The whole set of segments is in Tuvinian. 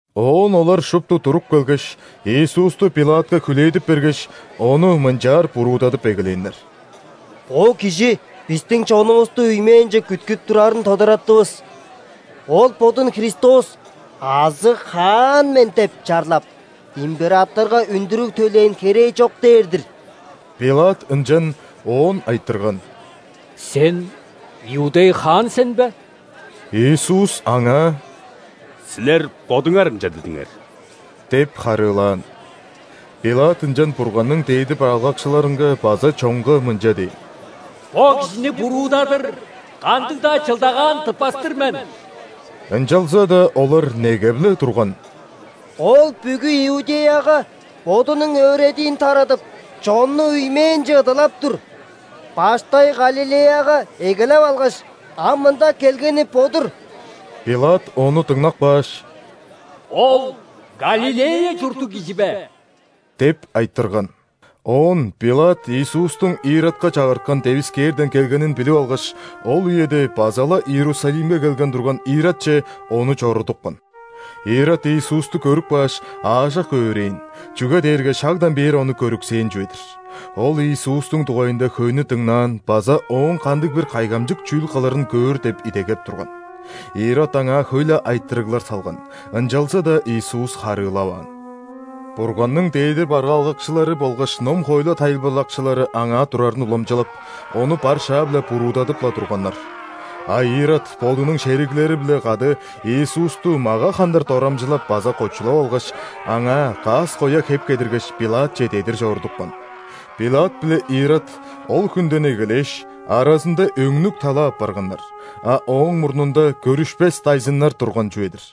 Оон олар шупту туруп келгеш, Иисусту ·Пилатка хүлээдип бергеш, Ону мынчаар буруудадып эгелээннер: «Бо кижи бистиң чонувусту үймээнче күткүп турарын тодараттывыс. Ол Бодун Христос азы Хаан мен деп чарлап, императорга үндүрүг төлээн херээ чок дээр-дир». Пилат ынчан Оон айтырган: «Сен – иудей хаан сен бе?» Иисус аңаа: «Силер бодуңар ынча дидиңер» – деп харыылаан. Пилат ынчан Бурганның дээди бараалгакчыларынга база чонга мынча дээн: «Бо кижини буруудадыр кандыг-даа чылдагаан тыппас-тыр мен». Ынчалза-даа олар негеп-ле турган: «Ол бүгү Иудеяга Бодунуң өөредиин тарадып, чонну үймээнче ыдалап тур, баштай Галилеяга эгелеп алгаш, ам мында келгени бо-дур». Пилат ону дыңнап кааш: «Ол Галилея чурттуг кижи бе?» – деп айтырган. Оон Пилат Иисустуң Иродка чагырткан девискээрден келгенин билип алгаш, ол үеде база-ла Иерусалимге келген турган Иродче Ону чорудупкан. Ирод Иисусту көрүп кааш, аажок өөрээн, чүге дээрге шагдан бээр Ону көрүксээн чүве-дир. Ол Иисустуң дугайында хөйнү дыңнаан база Ооң кандыг-бир кайгамчык чүүл кылырын көөр деп идегеп турган. Ирод Аңаа хөй-ле айтырыглар салган, ынчалза-даа Иисус харыылаваан. Бурганның дээди бараалгакчылары болгаш ном-хоойлу тайылбырлакчылары аңаа турарын уламчылап, Ону бар шаа-биле буруудадып-ла турганнар. А Ирод бодунуң шериглери-биле кады Иисусту мага хандыр дорамчылап база кочулап алгаш, Аңаа каас-коя хеп кедиргеш, Пилатче дедир чорудупкан. Пилат биле Ирод ол хүнден эгелээш, аразында өңнүк-тала апарганнар, а ооң мурнунда көрүшпес дайзыннар турган чүве-дир.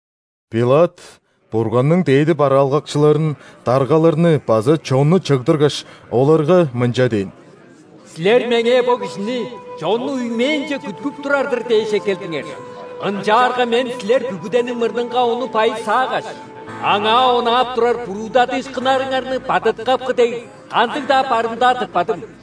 Пилат Бурганның дээди бараалгакчыларын, даргаларны база чонну чыгдыргаш, оларга мынча дээн: «Силер меңээ бо кижини, чонну үймээнче күткүп турар-дыр дээш, эккелдиңер. Ынчаарга мен силер бүгүдениң мурнунга Ону байысаагаш, Аңаа онаап турар буруудадыышкыннарыңарны бадыткапкы дег кандыг-даа барымдаа тыппадым.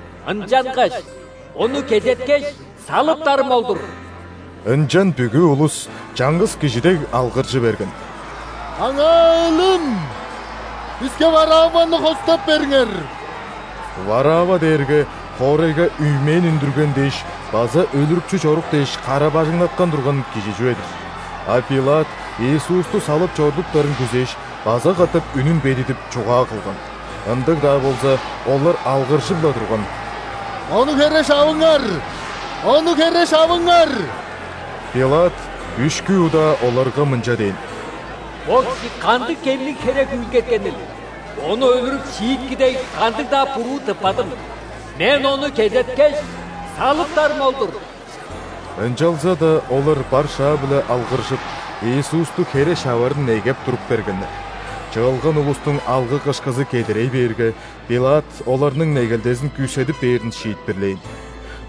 Ынчангаш Ону кезеткеш, салыптарым ол-дур». Ынчан бүгү улус, чаңгыс кижи дег, алгыржы берген: «Аңаа – өлүм! Биске Варавваны хостап бериңер!» Варавва дээрге хоорайга үймээн үндүрген дээш база өлүрүкчү чорук дээш кара-бажыңнаткан турган кижи чүве-дир. А Пилат Иисусту салып чорудуптарын күзээш, база катап үнүн бедидип, чугаа кылган. Ындыг-даа болза, олар алгыржып-ла турган: «Ону хере шавыңар! Ону хере шавыңар!» Пилат үшкү удаа оларга мынча дээн: «Бо кижи кандыг кемниг херек үүлгеткенил? Ону өлүрүп шиитки дег кандыг-даа буруу тыппадым. Мен Ону кезеткеш, салыптарым ол-дур!» Ынчалза-даа олар бар шаа-биле алгыржып, Иисусту хере шаварын негеп туруп бергеннер. Чыылган улустуң алгы-кышкызы кедерей бээрге, Пилат оларның негелдезин күүседип бээрин шиитпирлээн.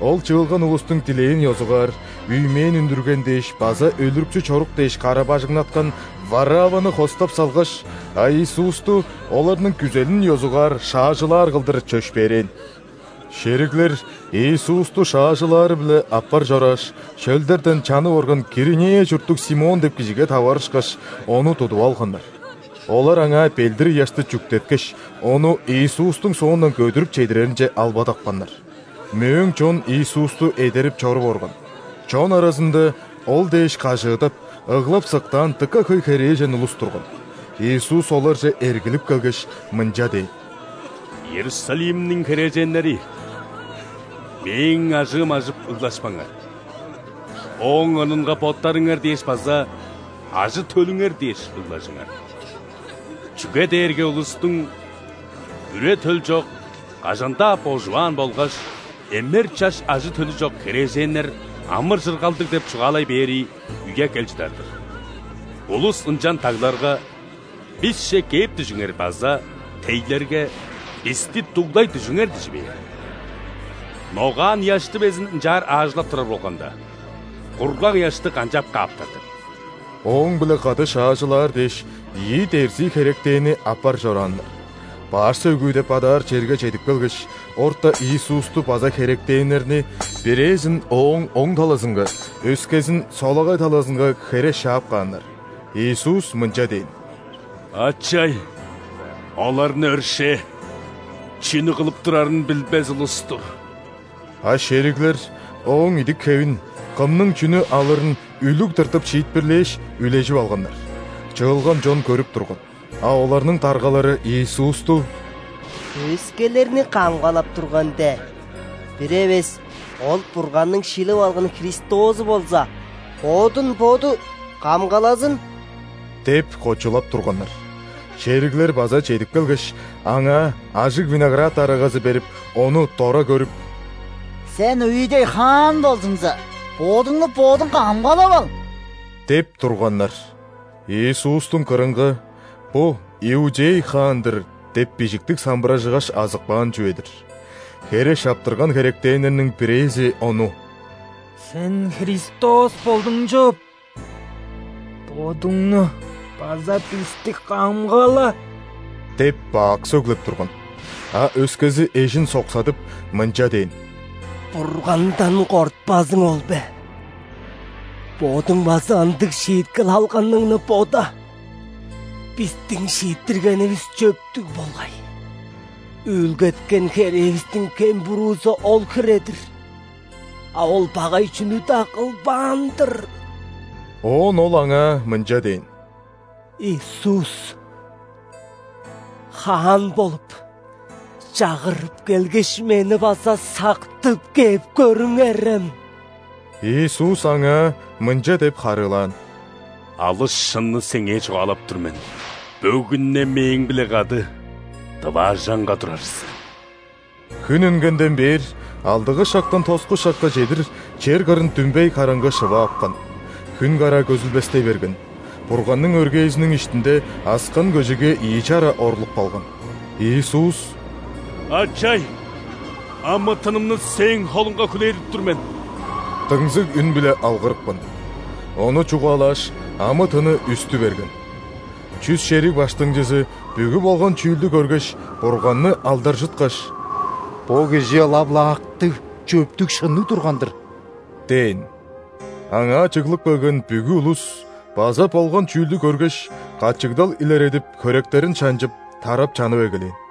Ол чыылган улустуң дилээн ёзугаар үймээн үндүрген дээш база өлүрүкчү чорук дээш кара-бажыңнаткан Варавваны хостап салгаш, а Иисусту оларның күзелин ёзугаар шаажылаар кылдыр чөпшээрээн. Шериглер Иисусту шаажылаары-биле аппар чорааш, шөлдерден чанып орган Киринея чурттуг Симон деп кижиге таварышкаш, ону тудуп алганнар. Олар аңаа ·белдир-ыяшты чүктеткеш, ону Иисустуң соондан көдүрүп чедиреринче албадапканнар. Мөөң чон Иисусту эдерип чоруп орган. Чон аразында Ол дээш кажыыдап, ыглап-сыктаан дыка хөй херээжен улус турган. Иисус оларже эргилип келгеш, мынча дээн: «Иерусалимниң херээженнери, Мээң ажыым ажып ыглашпаңар! Ооң орнунга боттарыңар дээш база ажы-төлүңер дээш, ыглажыңар. Чүге дээрге улустуң: „Үре-төл чок, кажан-даа божуваан болгаш эмер чаш ажы-төлү чок херээженнер амыр-чыргалдыг“ – деп чугаалай бээри үе кел чыдар-дыр. Улус ынчан дагларга: „Бисче кээп дүжүңер“ база тейлерге: „Бисти дуглай дүжүңер!“ – дижи бээр. Ногаан ыяшты безин ынчаар аажылап турар болганда, кургаг ыяшты канчап кааптар деп?» Ооң-биле кады шаажылаар дээш, ийи дерзии херектенни аппар чорааннар. Баш сөөгү деп адаар черге чедип келгеш, орта Иисусту база херектеннерни: бирээзин Ооң оң талазынга, өскезин – солагай талазынга хере шаап кааннар. [Иисус мынча дээн: «Ачай! Оларны өршээ, чүнү кылып турарын билбес улус-тур».] А шериглер Ооң идик-хевин, кымның чүнү алырын үлүг тыртып шиитпирлээш, үлежип алганнар. Чыылган чон көрүп турган. А оларның даргалары Иисусту: «Өскелерни камгалап турган де! Бир эвес Ол Бурганның шилип алган Христозу болза, Бодун Боду камгалазын!» – деп кочулап турганнар. Шериглер база чедип келгеш, Аңаа ажыг виноград арагазы берип, Ону дора көрүп: «Сен – иудей хаан болзуңза, Бодуңну Бодуң камгалап ал!» – деп турганнар. Иисустуң кырынга: «Бо – иудей хаан-дыр» – деп бижиктиг самбыражыгаш азып каан чүве-дир. Хере шаптырган херектеннерниң бирээзи Ону: «Сен Христос болдуң чоп, Бодуңну база бисти камгала!» – деп бак сөглеп турган. А өскези эжин соксадып, мынча дээн: «Бургандан кортпазың ол бе? Бодуң база ындыг шииткел алганыңны бода! Бистиң шииттиргенивис чөптүг болгай, үүлгеткен херээвистиң кем-буруузу ол хире-дир, а Ол багай чүнү-даа кылбаан-дыр». Оон ол Аңаа мынча дээн: «Иисус, Хаан болуп, чагырып келгеш, мени база сактып кээп көрүңерем». Иисус аңаа мынча деп харыылаан: «Алыс шынны сеңээ чугаалап тур мен: бөгүн-не Мээң-биле кады дываажаңга турар сен». Хүн үнгенден бээр алдыгы шактан тоску шакка чедир чер кырын дүмбей караңгы шыва апкан. Хүн караа көзүлбестей берген, Бурганның өргээзиниң иштинде аскан көжеге ийи чара орлуп калган. Иисус: «Ачай! Амы-тынымны Сээң холуңга хүлээдип тур мен» – дыңзыг үн-биле алгырыпкан. Ону чугаалааш, амы-тыны үстү берген. Чүс шериг баштыңчызы бүгү болган чүүлдү көргеш, Бурганны алдаржыткаш: «Бо кижи ылап-ла актыг, чөптүг-шынныг турган-дыр!» – дээн. Аңаа чыглып келген бүгү улус база болган чүүлдү көргеш, качыгдал илередип хөректерин шанчып, тарап чанып эгелээн.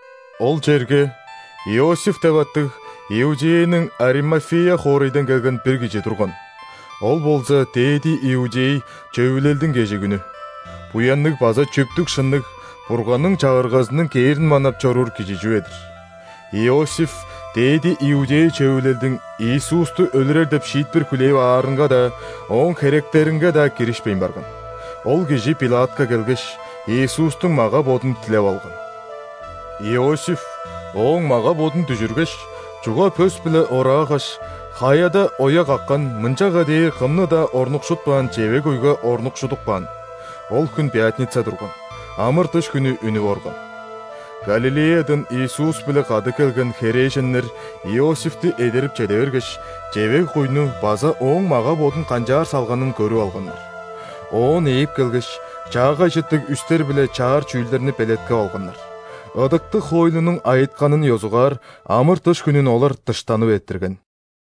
Ол черге Иосиф деп аттыг, Иудеяның Аримафея хоорайдан келген бир кижи турган. Ол болза ·дээди иудей Чөвүлелдиң кежигүнү, буянныг база чөптүг-шынныг, Бурганның Чагыргазының кээрин манап чоруур кижи чүве-дир. Иосиф дээди иудей Чөвүлелдиң Иисусту өлүрер деп шиитпир хүлээп аарынга-даа, ооң херектеринге-даа киришпейн барган. Ол кижи Пилатка келгеш, Иисустуң мага-бодун дилеп алган. Иосиф Ооң мага-бодун дүжүргеш, чуга пөс-биле ораагаш, хаяда оя каккан, мынчага дээр кымны-даа орнукшутпаан чевег-куйга орнукшудуп каан. Ол хүн пятница турган, ·амыр-дыш хүнү үнүп орган. Галилеядан Иисус-биле кады келген херээженнер Иосифти эдерип чеде бергеш, чевег-куйну база Ооң мага-бодун канчаар салганын көрүп алганнар. Оон ээп келгеш, чаагай чыттыг үстер биле чаар чүүлдерни белеткеп алганнар. Ыдыктыг хоойлунуң айытканын ёзугаар амыр-дыш хүнүн олар дыштанып эрттирген.